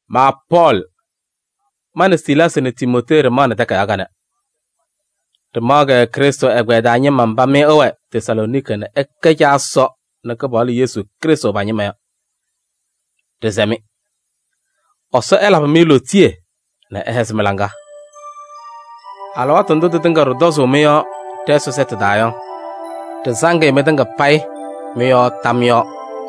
Ma Pɔɔlɩ, ma nɛ Silaasɩ nɛ Timootee ɖɩmaɣnɩ takayaɣ kanɛ. Ɖɩmaɣ-kɛ Krɩstʋ ɛgbɛyɛ taa ñɩma mba mɩ ɩwɛ Tesalooniki nɛ ɩkɛ Caa Ɛsɔ nɛ Kɩpaɣlʋ Yesu Krɩstʋ pa-ñɩma yɔ. Ɖɩsɛ-mɩ: Ɛsɔ ɛlabɩ-mɩ lootiye nɛ ɛhɛzɩ mɩ-laŋa! Alɩwaatʋ ndʋ tɩtɩŋa ɖɩtɔzʋʋ mɩ-yɔɔ ɖɛ-Ɛsɔ sɛtʋ taa yɔ, ɖɩsaŋ-ɩ mɩtɩŋa payɩ mɩ-yɔɔ tam yɔɔ.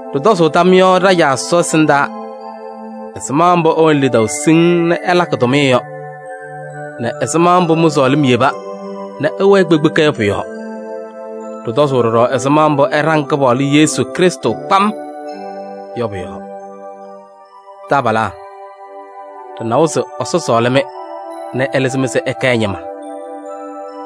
Ɖɩtɔzʋʋ tam yɔɔ ɖa-Caa Ɛsɔ ɛsɩndaa ɛzɩma mbʋ ɩwɛnɩ lidaʋ siŋŋ nɛ ɩlakɩ tʋmɩyɛ yɔ nɛ ɛzɩma mbʋ mɩ-sɔɔlɩm yeba nɛ ɩwɛɛ kpekpeka yɔ pʋ-yɔɔ. Ɖɩtɔzʋʋ ɖɔɖɔ ɛzɩma mbʋ ɩɖaŋ Kɩpaɣlʋ Yesu Krɩstʋ kpam yɔ pʋ-yɔɔ. Taabalaa! Ɖɩnawa se Ɛsɔ sɔɔlɩ-mɩ nɛ ɛlɩzɩ-mɩ se ɩkɛ ɛ-ñɩma.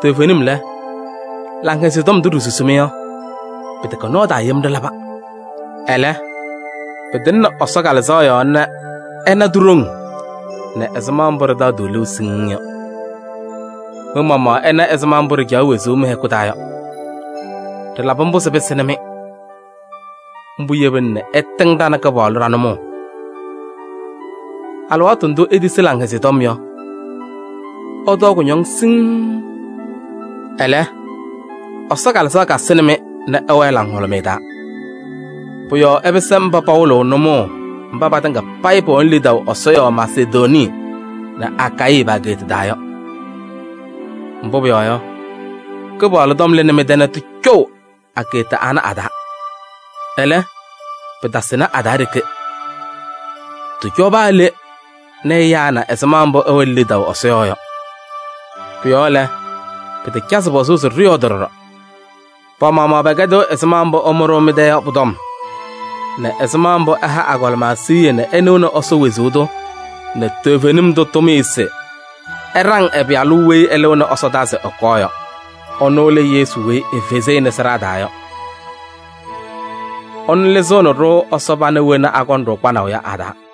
Toovenim lɛ, Laŋhɛzɩyɛ Tɔm ndʋ ɖisusi-mɩ yɔ, pɩtɛkɛ nɔɔ taa yem ɖɩlaba. Ɛlɛ, pɩtɩŋnɩ Ɛsɔ Kalɩzaɣ yɔɔ nɛ ɩna ti-ɖoŋ nɛ ɛzɩma ɖɩtaɣ-tʋ liu siŋŋ yɔ. Mɩ-maɣmaɣ ɩna ɛzɩma mbʋ ɖɩcaɣ wezuu mɩ-hɛkʋ taa yɔ, ɖɩlabɩ mbʋ se pɩsɩnɩ-mɩ. Mbʋ yebina nɛ ɩtɩŋ ɖa nɛ Kɩpaɣlʋ ɖa-nʋmɔʋ. Alɩwaatʋ ndʋ itisi Laŋhɛzɩyɛ Tɔm yɔ, ɩtɔɔ kʋñɔŋ siŋŋ. Ɛlɛ, Ɛsɔ Kalɩzaɣ kasɩnɩ-mɩ nɛ ɩwɛɛ laŋhʋlʋmɩyɛ taa. Pʋ-yɔɔ ɩpɩsɩ mba pawɩlɩɣ nʋmɔʋ mba patɩŋa payɩ pɛwɛnɩ lidaʋ Ɛsɔ yɔɔ Masedonii nɛ Akayɩ pa-ageeta taa yɔ. Mbʋ pʋyɔɔ yɔ, Kɩpaɣlʋ tɔm lɩnɩ mɩ-tɛ nɛ tɩcɔʋ ageeta ana a-taa. Ɛlɛ, pɩtasɩnɩ a-taa ɖeke, tɩcɔ paa le nɛ ɛyaa na ɛzɩma mbʋ ɩwɛnɩ lidaʋ Ɛsɔ yɔɔ yɔ. Pʋ-yɔɔ lɛ, pɩtacazɩ pɔzʋʋ se ɖɩyɔɔdɩ ɖɔɖɔ. Pa-maɣmaɣ pɛkɛdɩɣ ɛzɩma mbʋ ɩmʋ-ɖʋ mɩ-tɛ yɔ pʋ-tɔm nɛ ɛzɩma mbʋ ɩha agɔlɩma siɣye nɛ ɩnɩɣnɩ Ɛsɔ wezuu tʋ nɛ toovenim tʋ tʋmɩyɛ se ɩɖaŋ ɛ-Pɩyalʋ weyi ɛlɩɣnɩ ɛsɔdaa se ɛkɔɔ yɔ. Ɛnʋ lɛ Yesu weyi efezi-i nɛ sɩɖaa taa yɔ. Ɛnʋ lɩzɩɣnɩ-ɖʋ Ɛsɔ pana wena akɔŋ-ɖʋ kpanaʋ yɔ a-taa.